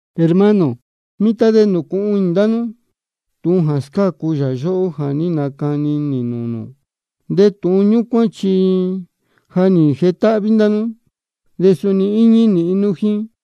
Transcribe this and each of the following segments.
Hermano, mitan de nūcūhun inī ndá nú tūhun jā scácu yā yóhó jā ní nacani nī nūū nū. De tūhun ñúcuán chi ja nī jetáhví ndá nú, de suni íñí nīhin nú jíín.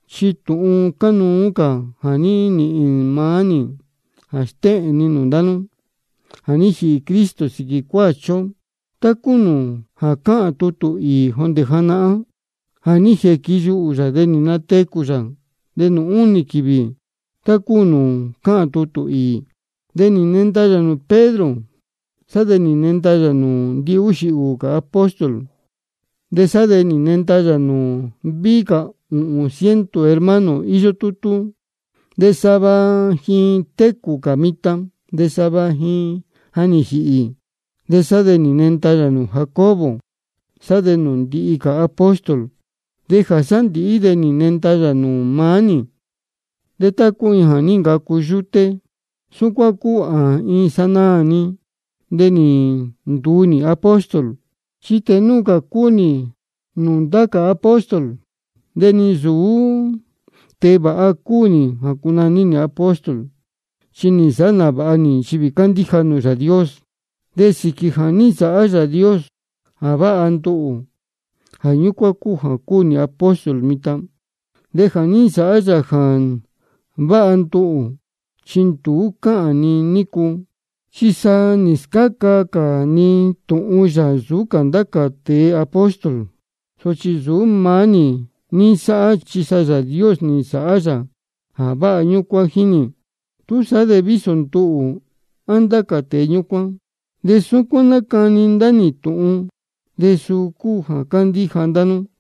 Chi tūhun cánuú cā jā ní nīhīn maá nī nī nastéhēn ni nūū ndá nú: Jā ní jīhī Cristo sīquī cuāchi ó, tá cúu nūū ja cáhān tutū īī jondē janahán. De nī jīquiyuhū yā, de nī natecū yā nūū únī quīvī, tá cúu nūū cáhān tutū īī. De nī nenda yā nūū Pedro. De sá de nī nenda yā nūū ndihúxī cā apóstol. De sá de nī nenda yā nūū víhí cā ūhūn ciento hermano jā íyó tútú. De sava ji técū cā mitan, de sava ji ja nī jīhī. De sá de nī nenda yā nūū Jacobo, sá de nūū ndihi cā apóstol. De jā sándīhí de nī nenda yā nūū maá nī. De tá cúu iin jā ní ncacu yúté, súcuán cúu jā iin sanaā-ni de nī nduu nī apóstol. Chi tēe núu cā nūū ndá cā apóstol cúu nī, de ni nsūú tēe vāha cúu nī jā cunaní nī apóstol, chi nī nsāhá nāvāha nī nchivī cándíja nūū Yāā Dios. De sīquī jā ní nsāhá Yāā Dios jā váha nduhū, jā ñúcuán cúu jā cúu nī apóstol mitan. De jā ní nsāhá yā jā váha nduhū, chi nduú cāhá ní ncúu, chi sa nī scáca cā ni tūhun yā nsūú cā ndá cā tēe apóstol. Sochi nsūú maá nī ní nsáhá, chi sa Yāā Dios nī nsāhá yā jā váha ñúcuán jíín nī. Túsaá de vísō nduhū á ndá cā tēe ñúcuán, de súcuán nácani ndá nī tūhun, de suu cúu jā ní ncandíja ndá nú.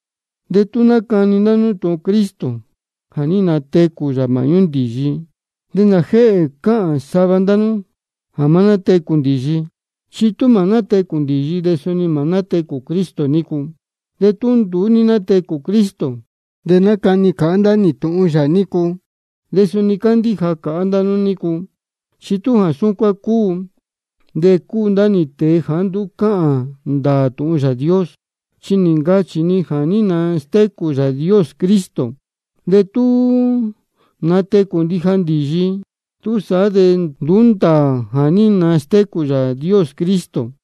De tú nácani ndá nī tūhun Cristo jā ní natecū yā māhñú ndīyi, ¿de nājēhē cáhān sava ndá nú jā má nátecū ndīyi? Chi tú mā nátecū ndīyi, de suni mā nátecū Cristo nícu. De tú nduú ní nátecū Cristo, de nácani cāhá ndá nī tūhun yā nícu, de suni cándíja cāhá ndá nú nícu. Chi tú jā súcuán cúu, de cúu ndá nī tēe jāá nduú cáhān ndāā tūhun Yāā Dios, chi nī ncachī ni jā ní nastécū Yāā Dios Cristo. De tú mā nátecū ndija ndīyi, túsaá de nduú ndāā jā ní nastécū Yāā Dios Cristo.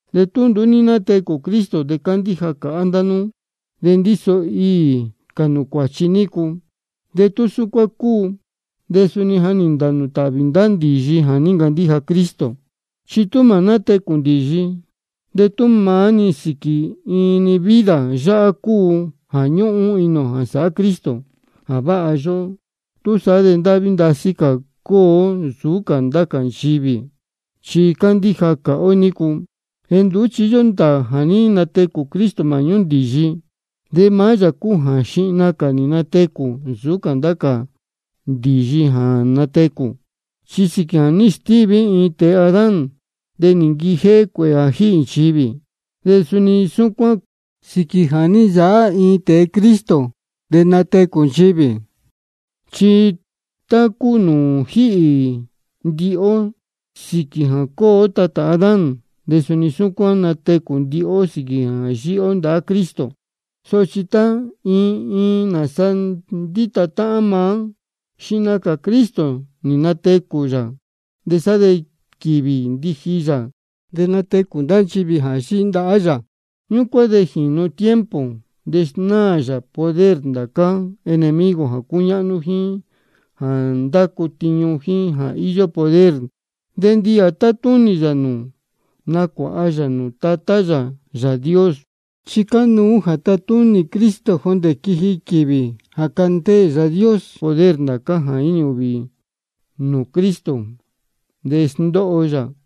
De tú nduú ní nátecū Cristo, de cándíja cāhá ndá nú de ndíso iī cā nū cuāchi nú nícu. De tú jā súcuán cúu, de suni ja nī ntānū tāhvī ndá ndīyi jā ní ncandíja Cristo. Chi tú mā nátecū ndīyi, de tú maá-ni sīquī iin-ni vida yáhá cúu jā ñúhún inī ō jā sāhá Cristo jā váha yóhó, túsaá de ndáhví ndasí cā cúu ó nsūú cā ndá cā nchivī, chi cándíja cāhá ó nícu. De nduú chi íyó ndāā jā ní natecū Cristo māhñú ndīyi. De maá yā cúu jā xihna cā nī natecū nsūú cā ndācá cā ndīyi jā natecū. Chi sīquī jā ní stíví iin-ni tēe Adán, de nī nquijéhé cuēhē jā jíhī nchivī. De suni súcuán sīquī jā ní nsāhá iin-ni tēe Cristo, de nátecū nchivī. Chi tá cúu nūū jíhī ndihi ó sīquī jā cúu ó tatā Adán, de suni súcuán natecū ndihi ó sīquī jā yíhí ó ndahá Cristo. Sochi tá iin iin nāsa ndíta táhán maá: Xihna cā Cristo nī natecū yā, de sá de quīvī ndiji yā de natecū ndá nchivī jā yíhí ndahá yā. Ñúcuán de jīnu tiempo, de snáā yā poder ndācá enemigo jā cúñáhnú, jíín jā ndácu tiñu, jíín jā íyó poder. De ndihi jā tátúnī yā nūū, nacuāha yā nūū Tatá yā Yāā Dios. Chi cánuú jā tatúnī Cristo jondē quiji quīvī jā candeē Yāā Dios poder ndācá jā jínī ūhvī nūū Cristo, de sndóho yā.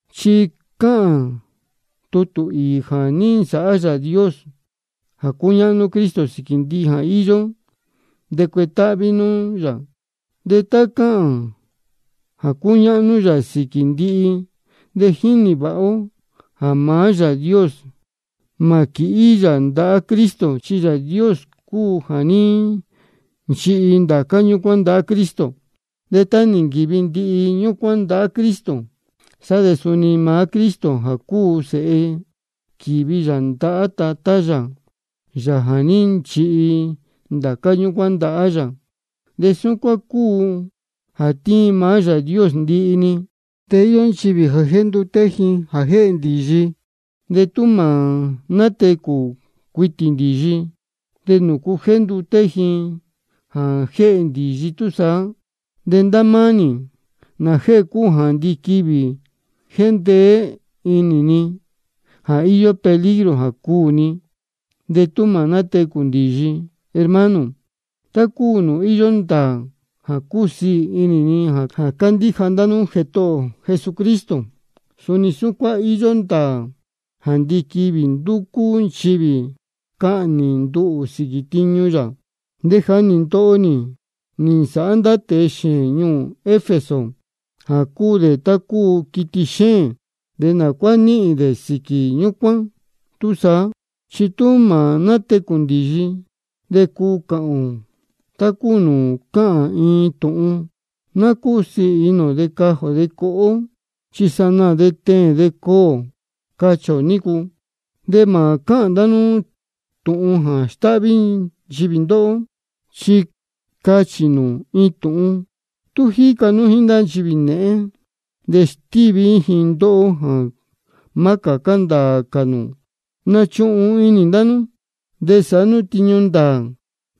Chi cáhān tutū īī jā ní nsāhá Yāā Dios jā cúñáhnú Cristo sīquī ndihi jā íyó, de cuetáhví nūū yā. De tá cáhān jā cúñáhnú yā sīquī ndihi-ni, de jínī vāha ó jā maá Yāā Dios mā quīhí yā ndahá Cristo, chi Yāā Dios cúu jā ní nchihi ndācá ñúcuán ndahá Cristo. De tá nī nquīvi ndihi ñúcuán ndahá Cristo, sá de suni maá Cristo jā cúu yā Sēhe, quīvi yā ndahá maá Tatá yā, Yāā jā ní nchihi ndācá ñúcuán ndahá yā. De súcuán cúu jā tiin maá Yāā Dios ndihi-ni. De íyó nchivī jā jénduté ji jā jéhē ndīyi. De tú mā nátecū cuitī ndīyi, ¿de nūcu jénduté ji jā jéhē ndīyi túsaá? De ndá máá nī, ¿nājēhē cúu jā ndiquivī jéndeé inī ni jā íyó peligro jā cuū ni, de tú mā nátecū ndīyi? Hermano, tá cúu nūū íyó ndāā jā cúsiī inī ni jā cándíja ndá nú Jētohō ō Jesucristo, suni súcuán íyó ndāā jā ndiquivī ndúcú nchivī cahnī nduhū sīquī tiñu yā. De jā ní ndoho nī nī nsāhá ndá tēe xēēn ñuū Efeso jā cúu dē tá cúu quiti xéēn, ¿de nā cuá nīhīn ni sīquī ñúcuán túsaá? Chi tú mā nátecū ndīyi, de cuu cāhān ō tá cúu nūū cáchī iin tūhun: Ná cúsiī inī ō de cajī ō coho ó, chi sanaā de teēn de cuū ō, cachī ō nícu. Mā cuáha ndá nú tūhun jā stáhví nchivī ndóhó. Chi cáchī iin tūhun: Tú jíca nú jíín ndá nchivī nēhén, de stíví ji ndóhó jā má cācá ndāā cā nū. Nachuhun inī ndá nú, de sāhá nú tiñu ndāā,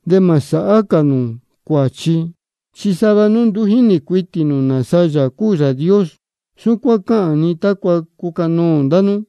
de mā sāhá cā nū cuāchi. Chi sava nú nduú jínī cuitī nū nāsa Yāā cúu Yāā Dios. Súcuán cáhān ni tácua cucanoō ndá nú.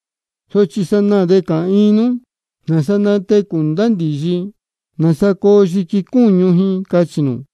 Sochi sanaā de cāhān iin nú: ¿Nāsa natecū ndá ndīyi? ¿Nāsa coo yiqui cúñu ji? cachī nū.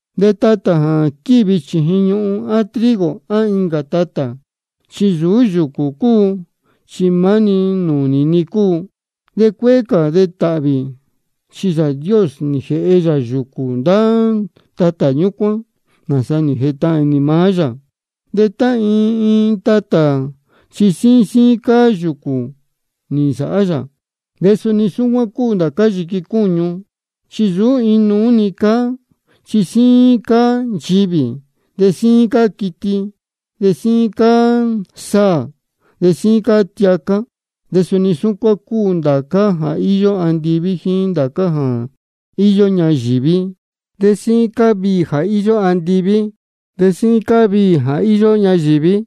De tatā jā quívi chījin ñuhun, á trigo á incā tatā, chi nsūú yūcū cúu, chi maá nūnī-ni cúu. De cuéé cā de tāhvī, chi Yāā Dios nī jēhe yā yūcū ndá tatā ñúcuán, nāsa nī jētahān inī maá yā, de tá iin iin tatā chi síín síín cáá yūcū nī nsāhá yā. De suni súcuán cúu ndācá yiqui cúñu, chi nsūú inuú cáá. Chi síín cáá nchivī, de síín cáá quiti, de síín cáá saā, de síín cáá tiacá. De suni súcuán cúu ndācá jā íyó andiví jíín ndācá jā íyó ñayīví. De síín cáá viī jā íyó andiví, de síín cáá viī jā íyó ñayīví.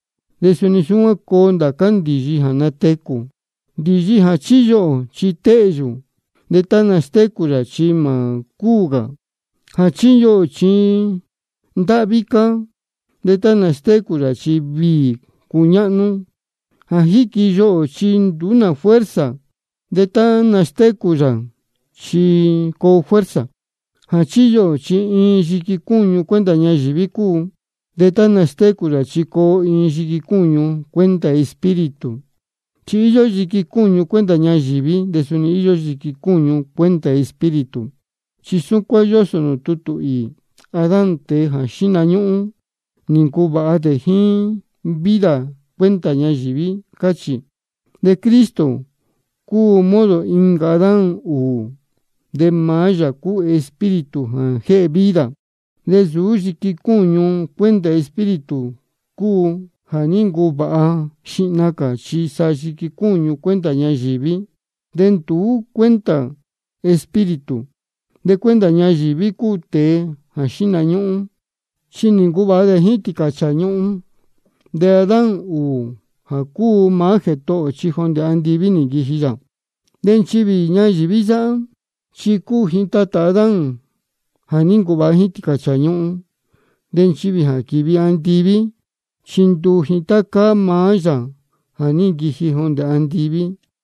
De suni súcuán coo ndá ndīyi jā natecū. Ndīyi jā chíyuhū ō chi téhyū, de tá nastécū yā chi mā cúū cā. Jā chíyuhū ō chi ndáhví cáá, de tá nastécū yā chi viī cuñáhnú. Jā chíyuhū ō chi nduú nā fuerza, de tá nastécū yā chi coo fuerza. Jā chíyuhū ō chi iin yiqui cúñu cuenta ñayīví cúu, de tá nastécū yā chi coo iin yiqui cúñu cuenta Espíritu. Chi íyó yiqui cúñu cuenta ñayīví, de suni íyó yiqui cúñu cuenta Espíritu. Chi súcuán yósō nūū tutū īī: Adán, tēe jā xíhna ñúhún, nī ncuvāha dē jíín vida cuenta ñayīví, cáchī. De Cristo cúu modo incā Adán ūū, de maá yā cúu Espíritu jā jéhe vida. De nsūú yiqui cúñu cuenta Espíritu cúu jā ní ncuvāha xihna cā, chi sa yiqui cúñu cuenta ñayīví, sá de nduu cuenta Espíritu. De cuenta ñayīví cúu tēe jā xíhna ñúhún, chi nī ncuvāha dē jíín tīcāchāā ñuhun. De Adán ūū jā cúu maá Jētohō ō, chi jondē andiví nī nquiji yā. De nchivī ñayīví yáhá, chi cúu ji táhán Adán jā ní ncuvāha jíín tīcāchāā ñuhun. De nchivī jā quívi andiví, chi ndúu ji tá cáá maá Yāā jā ní nquiji jondē andiví.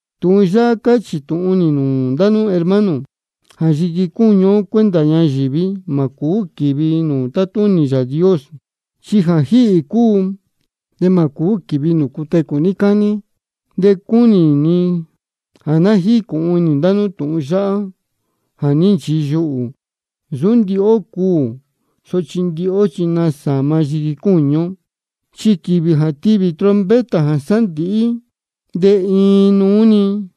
Tūhun yáhá cáchī tūhun nī nūū ndá nú hermano, jā yiqui cúñu ó cuenta ñayīví, mā cūú quīvi nūū tátúnī Yāā Dios. Chi jā jíhī cúu, de mā cūú quīvi nūū cutecū níí cání. De cúnī ni jā ná jícūhun inī ndá nú tūhun yáhá jā ní nchiyuhū: Nsūú ndihi ó cuū, sochi ndihi ó chi nasāma yiqui cúñu ó. Chi quīvī jā tivī trompeta jā sándīhí da, de iin núnúú-ni,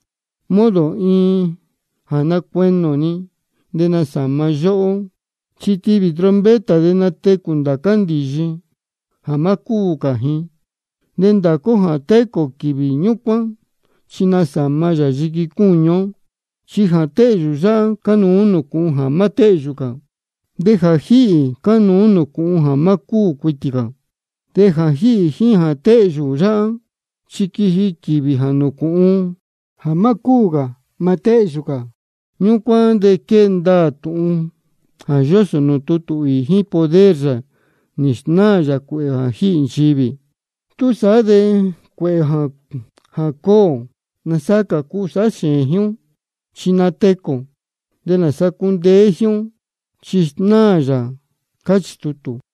modo iin jā nácueni ō-ni, de nasāma yā yóhó. Chi tivī trompeta, de natecū ndācá ndīyi jā má cúū cā ji. De ndācá ó jā técū ō quīvī ñúcuán, chi nasāma yā yiqui cúñu ó. Chi jā téhyū yáhá, cánuú nūcūhun jā má téhyū cā. De jā jíhī, cánuú nūcūhun jā má cúū cuitī cā. De jā jíhī jíín jā téhyū yáhá, chi quiji quīvī jā nūcūhun jā má cúū cā mā téhyū cā. Ñúcuán de quee ndaā tūhun jā yósō nūū tutū īī: Jíín poder yā nī snáā yā cuēhē jā jíhī nchivī. Túsaá de cuēhē jā cuū ō, ¿nāsa cā cuu sāhá xēēn jíín ó? Chi natecū ō. ¿De nāsa cā cundeé jíín ó? Chi snáā yā. Cáchī tutū.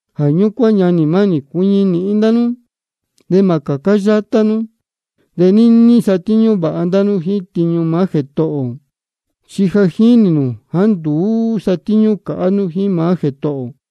Jā ñúcuán ñanī mánī, cuiñi nīhin ndá nú de mā cācá yátá nú. De níní satíñú vāha ndá nú jíín tiñu maá Jētohō ō. Chi ja jínī nū jāá nduú sátíñú cāhá nú jíín maá Jētohō ō.